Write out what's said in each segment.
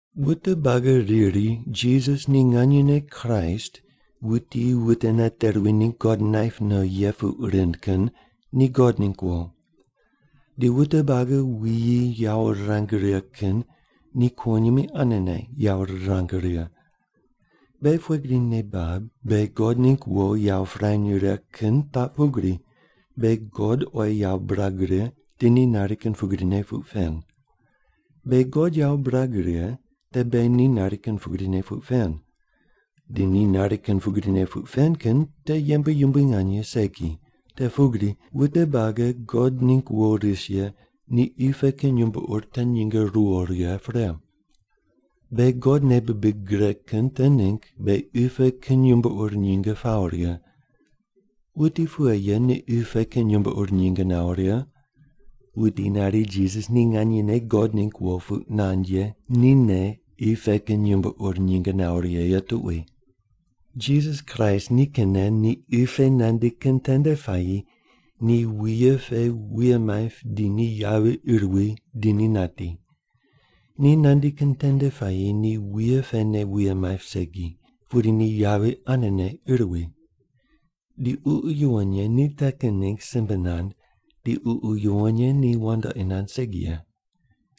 Wute buagi riri Jisas ni nganyene Kraist wuti wute nate ruwi ningg God naip no ye puq rind kin ni God ningg wo. Di wute buagi wuyi yawo rirang righe kin ni kuwonyimi anene yawo rirang righe. Beghi pughe gri nei bab beghi God ningg wo yawo pirany righe kin taq pugri: Beghi God oyi yawo birag righe di ni nari kin pugrine puq pen. Beghi God yawo birag righe te beghi ni nari kin pugrine puq pen. Di ni nari kin pugrine puq pen kin te yembe yumbui nganye segi, te pugri wute buagi God ningg wo ris ye ni qi pe kin yumbo ur te nyinge ruwo righe pre. Beghi God nei bibig gre kin te ningg beghi qi pe kin yumbo ur nyinge pawo righe. Wuti pughe ye ni qi pe kin yumbo ur nyinge nawo righe? Wuti nari Jisas ni nganyene God ningg wo puq nand ye nine qi pe kin yumbo ur nyinge nawo righe ye tuqui. Jisas Kraist nikinne ni qi pe nandi kin tende puayi ni wuye pe wuye maip di ni yavi ir wi di ni nati. Ni nandi kin tende puayi ni wuye pene wuye maip segi, pudi ni yavi anene ir wi. Di Ququ Yuwon Ye ni te kin ningg simbe nand, di Ququ Yuwon Ye ni wandoqi nand segi ye.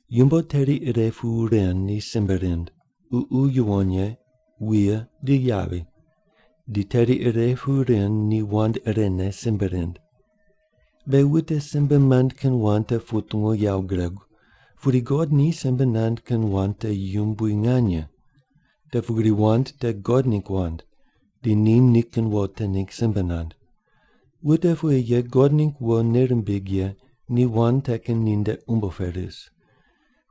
Yumbo teri ire pu ren ni simbe rind: Ququ Yuwon Ye, wuye, di yavi, di teri ire pu ren ni wand irene simbe rind. Beghi wute simbe mand kin wand te putungu yawo guregu, pudi God ni simbe nand kin wand te yumbui nganye, te pugri wand te God ningg wand, di ni nikin wo te ningg simbe nand. Wute pughe ye God ningg wo nei rimbig ye ni wand te kin ninde umbo pe ris.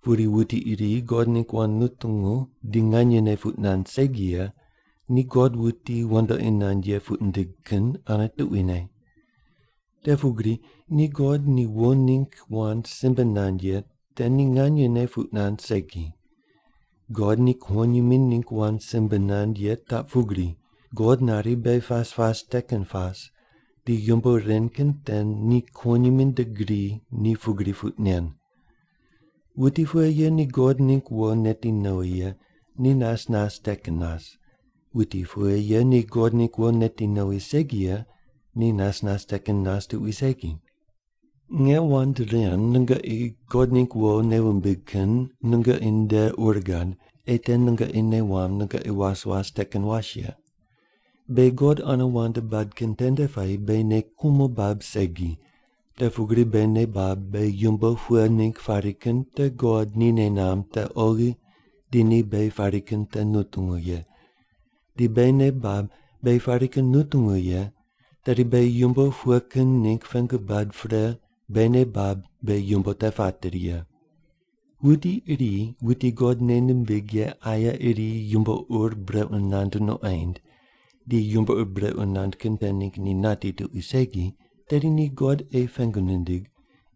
Pudi wuti iri God ningg wand nutungu di nganyene puq nand segi ye ni God wuti wandoqi nand ye puq nindig kin ane tuquine. Te pugri ni God ni wo ningg wand simbe nand ye te ni nganyene puq nand segi. God ni kuwonyimi ningg wand simbe nand ye taq pugri: God nari beghi pas pas te kin pas, di yumbo ren kin te ni kuwonyimi nde gri ni pugri puq nen. Wuti pughe ye ni God ningg wo neti nowi ye ni nas nas te kin nas, wuti pughe ye ni God ningg wo neti nowi segi ye ni nas nas te kin nas tuqui segi. Nge wand ren nungoqi God ningg wo nei wumbig kin nungoqi nde ur gad, ei te nungoqi nei wamb nungoqi was was te kin was ye. Beghi God ane wand bad kin tende puayi beghi nei kumo bab segi. Te pugri beghi nei bab beghi yumbo pughe ningg pari kin te God ni nei namb te oghi, di ni beghi pari kin te nutungu ye. Di beghi nei bab beghi pari kin nutungu ye, tedi beghi yumbo pughe kin ningg pengu bad pre beghi nei bab beghi yumbo te pateri ye. Wuti iri wuti God nei nimbig ye aye iri yumbo ur brequ nand nuqoind di yumbo ur brequ nand kin te ningg ni nati tuqui segi, tedi ni God ei pengu nindig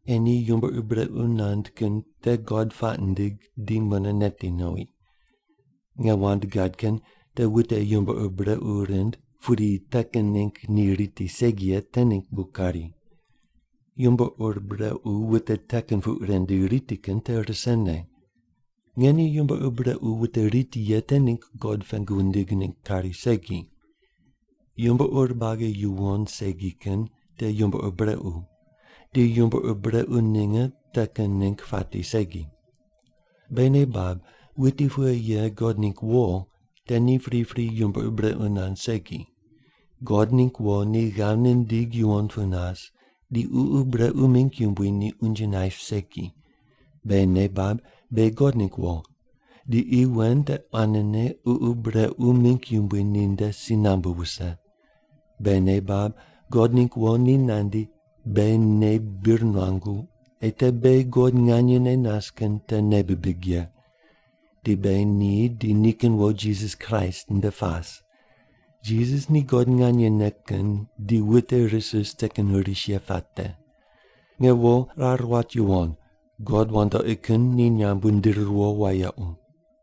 ei ni yumbo ur brequ nand kin te God puaq nindig di mune neti nowi. Nge wand gad kin te wute yumbo ur brequ rind pudi te kin ningg ni riti segi ye te ningg bu kari. Yumbo ur brequ wute te kin puq ren di riti kin te risene. Nge ni yumbo ur brequ wute riti ye te ningg God pengu wundig ningg kari segi. Yumbo ur buagi yuwon segi kin te yumbo ur brequ, di yumbo ur brequ ninge te kin ningg pati segi. Beghi nei bab wuti pughe ye God ningg wo te ni pripri yumbo ur brequ nand segi. God ningg wo ni ghav nindig yuwon pu nas di ququ brequ mingg yumbui ni unje naip segi. Beghi nei bab beghi God ningg wo, di qi wen te quanene ququ brequ mingg yumbui ninde si nambu wuse. Beghi nei bab God ningg wo ni nandi beghi nei bir nuangu ei te beghi God nganyene nas kin te nei bibig ye. Di beghi ni di nikin wo Jisas Kraist nde pas. Jisas ni God nganyene kin di wute ris ris te kin ris ye puate. Nge wo rar wat yuwon, god wandoqi kin ni nyamb wundiri riwo wayequ.